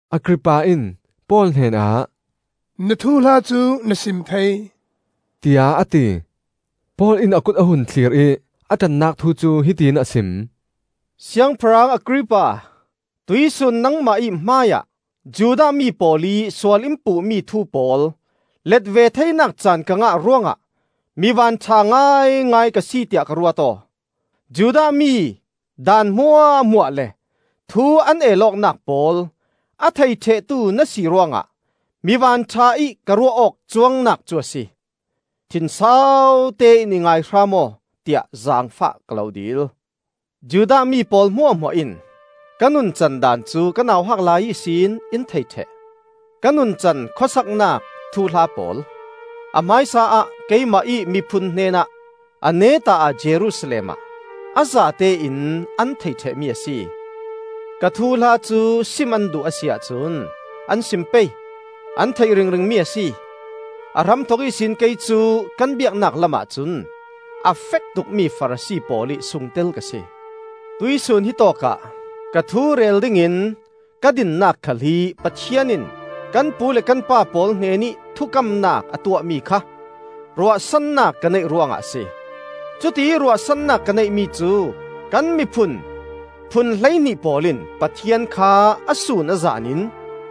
Agrippa in Paul hnenah, “Na thuhla cu na sim thei,” tiah a ti. Paul in a kut a hun thlir ih a ṭannak thu cu hiti in a sim: “Siangpahrang Agrippa, tuihsun nangmah ih hmaiah Judah mi pawl ih sual in puhmi thu pawl let ve theinak caan ka ngah ruangah mi vanṭha ngaingai ka si tiah ka ruat aw. Judah mi daan hmuahhmuah le thu an el awknak pawl a thei ṭhehtu na si ruangah mi vanṭha ih ka ruah awk cuangnak cu a si. Thinsautein i ngai hram aw, tiah zaangfah ka lo dil. “Judah mi pawl hmuahhmuah in ka nuncan daan cu ka nauhak lai ihsin in thei ṭheh. Ka nuncan khuasaknak thuhla pawl, a hmaisa-ah keimah ih miphun hnenah, a neta-ah Jerusalem ah, a zatein an theih ṭhehmi a si. Ka thuhla cu sim an duh a si ahcun an sim pei, an theih ringring mi a si. A hramthok ihsin kei cu kan biaknak lamah cun a fektukmi Farasi pawl ih sungtel ka si. Tuihsun hitawk ah ka thu rel dingin ka dinnak khal hi Pathian in kan pu le kan pa pawl hnenih thukamnak a tuahmi kha ruahsannak ka neih ruangah a si. Cutiih ruahsannak ka neihmi cu kan miphun phun hleihnih pawl in Pathian kha a sun a zan in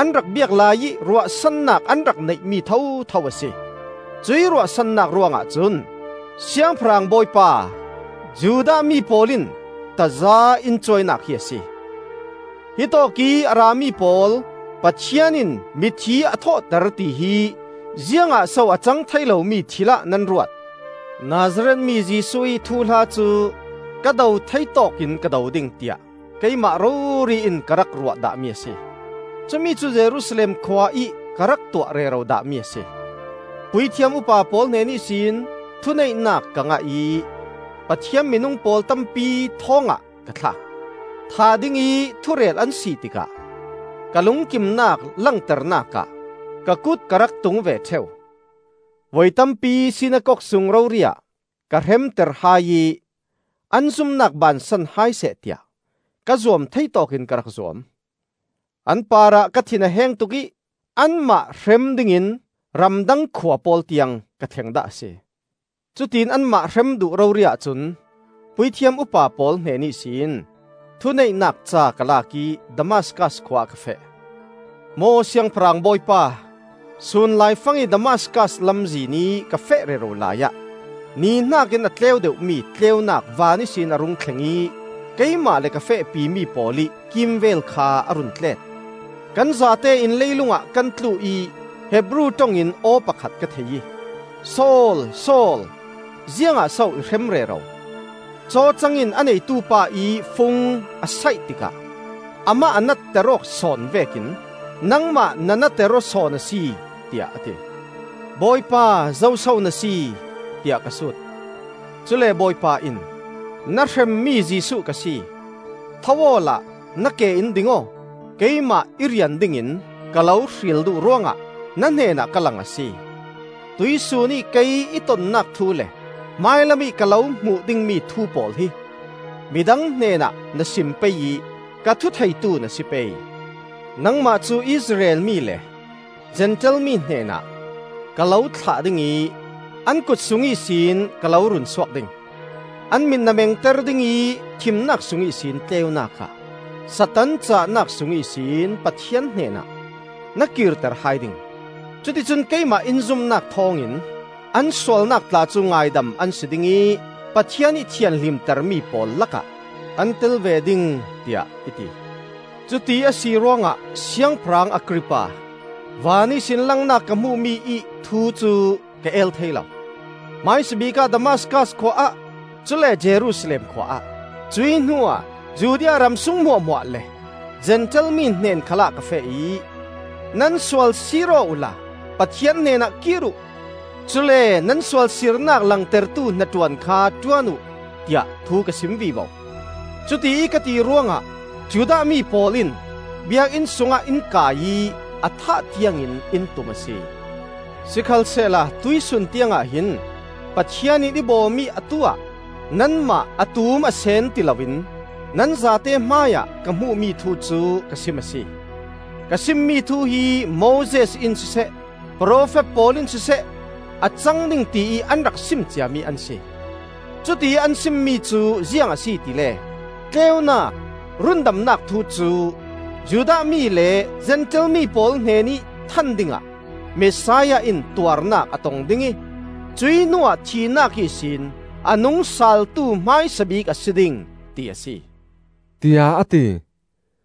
an rak biak laiih ruahsannak an rak neih mi thotho a si. Cuih ruahsannak ruangah cun Siangpahrang Bawipa, Judah mi pawl in taza in cuainak hi a si! Hitawkih a rami pawl, Pathian in mithi a thawhter tihi ziangah so a cang thei lomi thilah nan ruat? “Nazareth mi Jesuh ih thuhla cu ka do thei tawkin ka do ding, tiah keimah rori in ka rak ruah dahmi a si. Cumi cu Jerusalem khua ih ka rak tuah rero dahmi a si. Puithiam upa pawl hnen ihsin thuneihnak ka ngah ih Pathian minung pawl tampi thawngah ka thlak. Thah dingih thurel an si tikah ka lungkimnak langternak ah ka kut ka rak tung ve ṭheu. Voi tampi sinakok sung rori-ah ka hremter hai ih an zumnak bansan hai seh tiah ka zuam thei tawkin ka rak zuam. An parah ka thin a heng tuk ih anmah hrem dingin ramdang khua pawl tiang ka thleng dah a si. “Cutiin anmah hrem duh rori-ah cun Puithiam upa pawl hnen ihsin thuneihnak ca ka lak ih Damaskas khua ah ka feh. Maw siangpahrang Bawipa, sun laifangih Damaskas lamzinih ka feh rero laiah ni hnakin a tleu deuhmi tleunak van ihsin a rung thleng ih keimah le ka fehpi mi pawl ih kimvel kha a run tlet. Kan zatein leilungah kan tlu ih Hebru ṭong in aw pakhat ka thei ih, ‘Saul, Saul, ziangah so i hrem rero? Cawcang in a neitu pa ih fung a saih tikah amah a natter awk sawn vekin nangmah na nater aw sawn a si,’ tiah a ti. ‘Bawipa, zoso na si?’ tiah ka sut. Cule Bawipa in, ‘Na hremmi Jesuh ka si. Tho awla na ke in ding aw. Keimah i rian dingin ka lo hril duh ruangah na hnenah ka lang a si. Tuihsun ih kei i tonnak thu le hmailamih ka lo hmuh dingmi thu pawl hi midang hnenah na sim pei ih ka thutheitu na si pei. Nangmah cu Israel mi le Zentail mi hnenah ka lo thlah ding ih an kutsung ihsin ka lo runsuak ding. An mit na mengter ding ih thimnak sung ihsin tleunak ah, Satan cahnak sung ihsin Pathian hnenah na kirter hai ding. Cuti cun keimah in zumnak thawngin an sualnak tla cu ngaidam an si ding ih Pathian ih thianhlimtermi pawl lakah an tel ve ding,’ tiah i ti. “Cuti a si ruangah, Siangpahrang Agrippa, van ihsin langnak ka hmuhmi ih thu cu ka el thei lo. Hmaisabik ah Damaskas khua ah, cule Jerusalem khua ah, cuih hnuah Judea ramsung hmuahhmuah le Zentail mi hnen khalah ka feh ih, ‘Nan sual siir aw uhla Pathian hnenah kir uh; cule nan sualsirnak langtertu hnaṭuan kha ṭuan uh,’ tiah thu ka sim vivo. Cutiih ka ti ruangah Judah mi pawl in Biakinn sungah in kai ih a thah tiangin in tum a si. Sikhalsehla tuihsun tiangah hin Pathian in i bawm ih atu-ah, nanmah a tum a seen ti loin nan zate hmaiah ka hmuhmi thu cu ka sim a si. Ka simmi thu hi Moses in siseh, profet pawl in siseh a cang ding tiih an rak sim ciami an si. Cutiih an simmi cu ziang a si tile: tleunak rundamnak thu cu Judah mi le Zentail mi pawl hnenih than dingah Messiah in tuarnak a tong ding ih, cuih hnuah thihnak ihsin a nungsaaltu hmaisa bik a si ding, ti a si,” tiah a ti.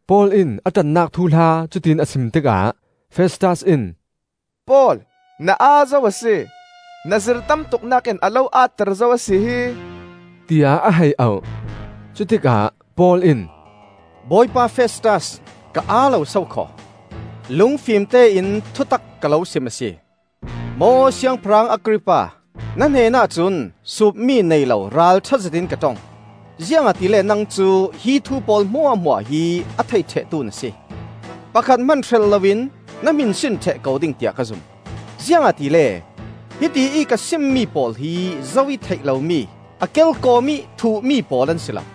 Paul in a ṭannak thuhla cutiin a sim tikah Festas in, “Paul, na aa zo a si! Na zir tamtuknak in a lo aatter zo a si hi!” tiah a hei auh. Cutikah Paul in, “Bawipa Festas, ka aa lo sokhaw! Lungfim tein thutak ka lo sim a si! Maw Siangpahrang Agrippa, na hnenah cun suupmi nei lo ralṭha zetin ka ṭong; ziangahtile nang cu hi thu pawl hmuahhmuah hi a thei ṭhehtu na si. Pakhat hman hrelh loin na hminsin ṭheh ko ding tiah ka zum, ziangahtile hiti ih ka simmi pawl hi zo ih theih lomi, a kelkawm-ih thuhmi pawl an si lo.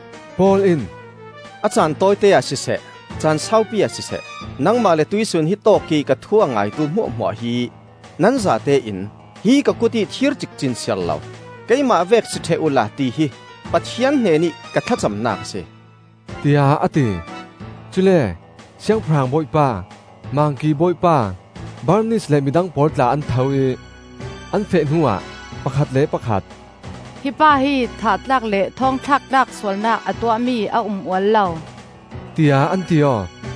Paul in, “A caan tawite ah siseh, caan saupi ah siseh, nangmah le tuihsun hitawk ih ka thu a ngaitu hmuahhmuah hi nan zatein, hi ka kutih thir cikcin siarlo, keimah vek si ṭheh uhla tihi Pathian hnenih ka thlacamnak a si,” tiah a ti. Cule Siangpahrang Bawipa, Mangki Bawipa, Bernis le midang pawl tla an tho ih, an feh hnuah pakhat le pakhat, “Hi pa hi thah tlak le thawng thlak tlak sualnak a tuahmi a um ual lo,” tiah an ti aw.